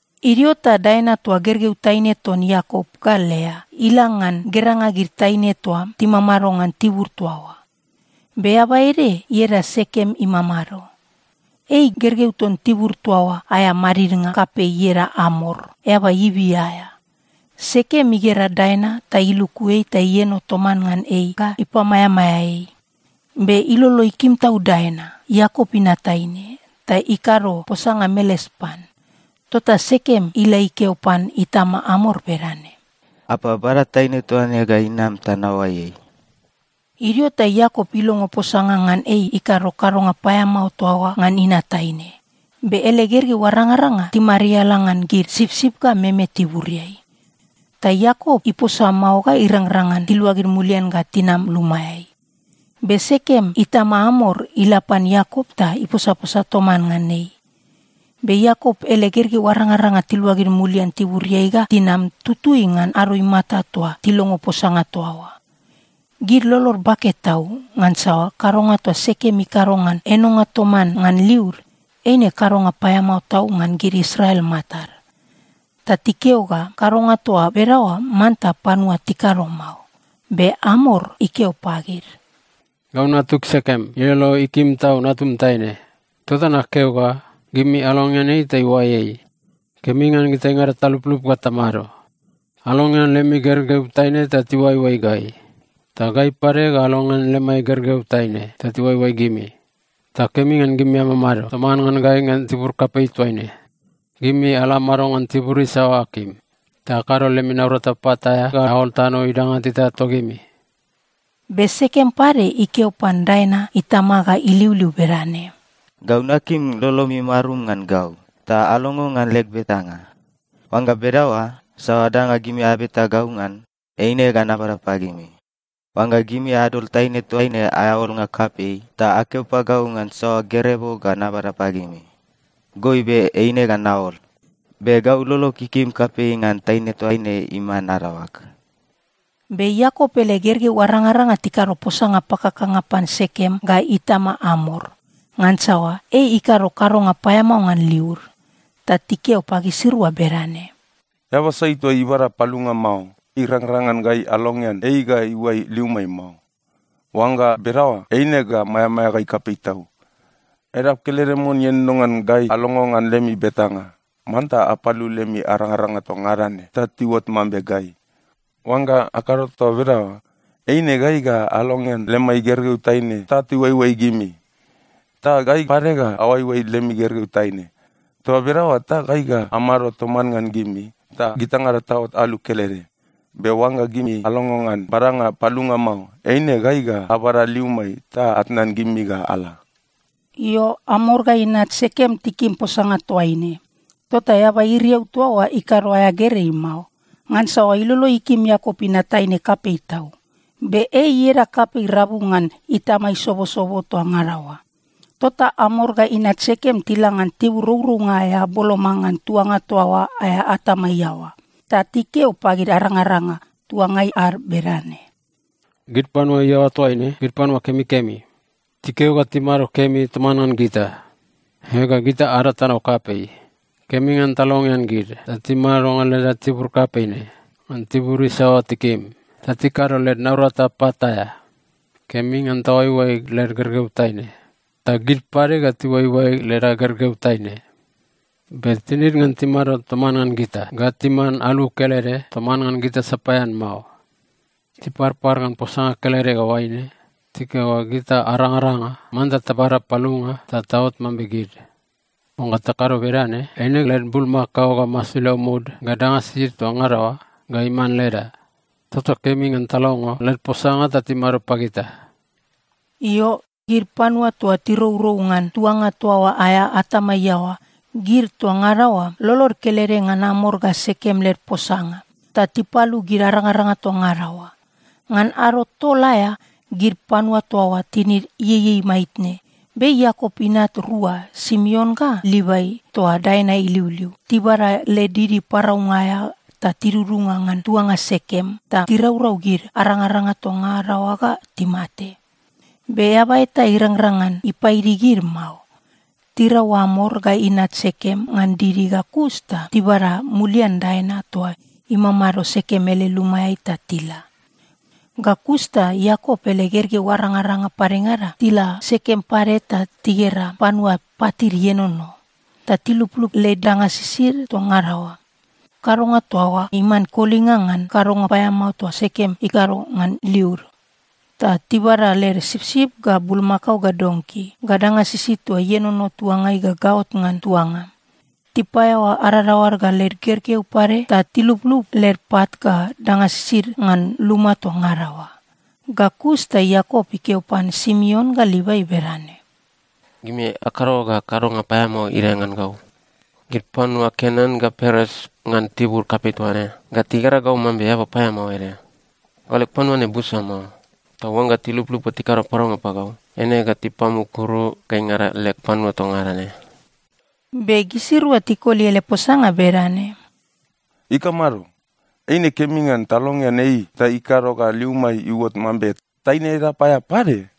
Idio ta Daina toa gergeu taine ton Iakop ga Lea, ila ngan geranga gid taine toa timamado ngan tibur toa oa. Be eaba ede ieda Sekem imamado. Ei gergeu ton tibur toa oa aea madidnga kapei ieda Amor, eaba Ivi aea. Sekem igera Daina ta iluku ei ta ieno toman ngan ei ga ipamaeamaea ei. Be ilolo ikim tau Daina, Iakop inat taine, ta ikado posanga meles pan. Tota Sekem ila ikeo pan itama Amor bedane, “Apa, bada taine toaine ga inam ta naoai ei.” Idio ta Iakop ilongo posanga ngan ei ikado kadonga paeamao toa oa ngan inat taine, be ele gergeu arangaranga timariala ngan gid sipsip ga meme tiburiai. Ta Iakop iposa mao ga irangrang ngan tiluagid mulian ga tinam lumaeai. Be Sekem itama Amor ila pan Iakop ta iposaposa toman ngan ei. Be Iakop ele gergeu arangaranga tiluagid mulian tiburiai ga tinam tutui ngan ado imata toa tilongo posanga toa oa. Gid lolod bake tau ngansa kadonga toa Sekem ikado ngan enonga toman ngan liud, eine kadonga paeamao tau ngan gid Israel matad, ta tikeo ga kadonga toa bedaoa manta panua tikado mao. Be Amor ikeo pagid, “Gau natug Sekem ilolo ikim tau natum taine, tota nakeo ga gimi alongean ei ta iuai ei. Kemi ngan gitaingada taluplup ga tamado. Alongean lemi gergeu taine ta tiuaioai gai, ta gai pade ga alongean lemai gergeu taine ta tiuaioai gimi. Ta kemi ngan gimi amamado toman ngan gai ngan tibur kapei toaine. Gimi ala amado ngan tibur isaoa akim. Ta akado lemi naurata pat aea ga aol tano idanga teta togimi.” Be Sekem pade ikeo pan Daina itama ga iliuliu bedane, “Gau nakim lolomi marum ngan gau, ta alongo ngan leg betanga. Oangga bedaoa, saoa danga gimi abeta gau ngan, eine ga nabada pagimi. Oangga gimi adol taine toaine aea olnga kapei ta akeo pagau ngan saoa gerebo ga nabada pagimi, goibe eine ga naol. Be gau lolog ikim kapei ngan taine toaine iman adaoag.” Be Iakop ele gergeu arangaranga tikado posanga pakakanga pan Sekem ga itama Amor, ngansa ei ikado kadonga paeamao ngan liud. Ta tikeo pagisirua bedane, “Eaba sai toa ibada palunga mao, irangrang ngan gai alongean ei ga iuai liumai mao. Oangga bedaoa, eine ga maeamaea gai kapei tau. Edap kelede mon ienono ngan gai alongo ngan lemi betanga: Manta apalu lemi arangaranga toa ngada ne, ta tiuot mambe gai. Oangga akado toa bedaoa, eine gai ga alongean lemai gergeu taine ta tiuaioai gimi, ta gai pade ga aoaioai lemi gergeu taine. Toa bedaoa ta gai ga amado toman ngan gimi ta gitaingada taot alu kelede. Be oangga gimi alongo ngan badanga palunga mao, eine gai ga abada liumai ta atnan gimi ga ala.” Io, Amor ga inat Sekem tikim posanga toaine. Tota eaba iriau toa oa ikado aea gerei mao, ngansa ilolo ikim Iakop inat taine kapei tau. Be ei ieda kapei rabu ngan itama isobosobo toa ngada oa. Tota Amor ga inat Sekem tila ngan tibur rourounga aea boloma ngan tuanga toa oa aea atama iaoa, ta tikeo pagid arangaranga tuangai ad bedane, “Gid panua iaoa toaine gid panua kemikemi, tikeo ga timado kemi toman ngan gita. Ega, gita ada tano kapei. Kemi ngan talongean gid ta timado ngan leda tibur kapei ne ngan tibur isaoa tikim, ta tikado led naurata pat aea. Kemi ngan taoaioai led gergeu taine, ta gid pade ga tiuaioai leda gergeu taine. Be tinid ngan timado toman ngan gita ga timan alu kelede toman ngan gita sapaean mao. Tiparpar ngan posanga kelede ga oaine: Tikeo ga gita arangaranga manta tabada palunga ta taot mambe gid. Oangga takado bedane, eine led bulmakao ga masilau mud ga danga sisid toa ngada oa ga iman leda! Tota kemi ngan talongo led posanga ta timado pagita.” Io, gid panua toa tirourou ngan tuanga toa oa aea atama iaoa, gid toa ngada oa lolod kelede ngan Amor ga Sekem led posanga, ta tipalu gid arangaranga toa ngada oa. Ngan ado tol aea gid panua toa oa tinid ieiei maitne, be Iakop inat rua Simeon ga Livai toa Daina iliuliu, tibada led didi paraunga aea ta tidudunga ngan tuanga Sekem ta tiraurau gid arangaranga toa ngada oa ga timate. Be eaba eta irangrang ngan ipaidi gid mao. Tirau Amor ga inat Sekem ngan didi ga kus ta tibada mulian Daina toa imamado Sekem ele lumaeai ta tila. Ga kus ta Iakop ele gergeu arangaranga padengada tila Sekem pade ta tigera panua patid ienono, ta tilublub led danga sisid toa ngada oa. Kadonga toa oa iman kolinga ngan kadonga paeamao toa Sekem ikado ngan liud. Ta tibada led sipsip ga bulmakao ga donki, ga danga sisid toa ienono tuangai ga gaot ngan tuanga. Tipaeaoa adadaoad ga led gergeu pade ta tilublub led pat ga danga sisid ngan luma toa ngada oa. Ga kus ta Iakop ikeo pan Simeon ga Livai bedane, “Gimi akado ga kadonga paeamao idae ngan gau. Gid panua Kenan ga Peres ngan tibur kapei toa ne ga tigera gau mambe eaba paeamao ede. Gau leg panua ne busa mao, ta oangga tiluplup ga tikado paraunga pagau, eine ga tipamukuru gaingada leg panua toa ngada ne.” Be gisirua tikoli ele posanga bedane, “Ikamado? Eine kemi ngan talongean ei ta ikado ga liumai iuot mambe taine edap aea pade?”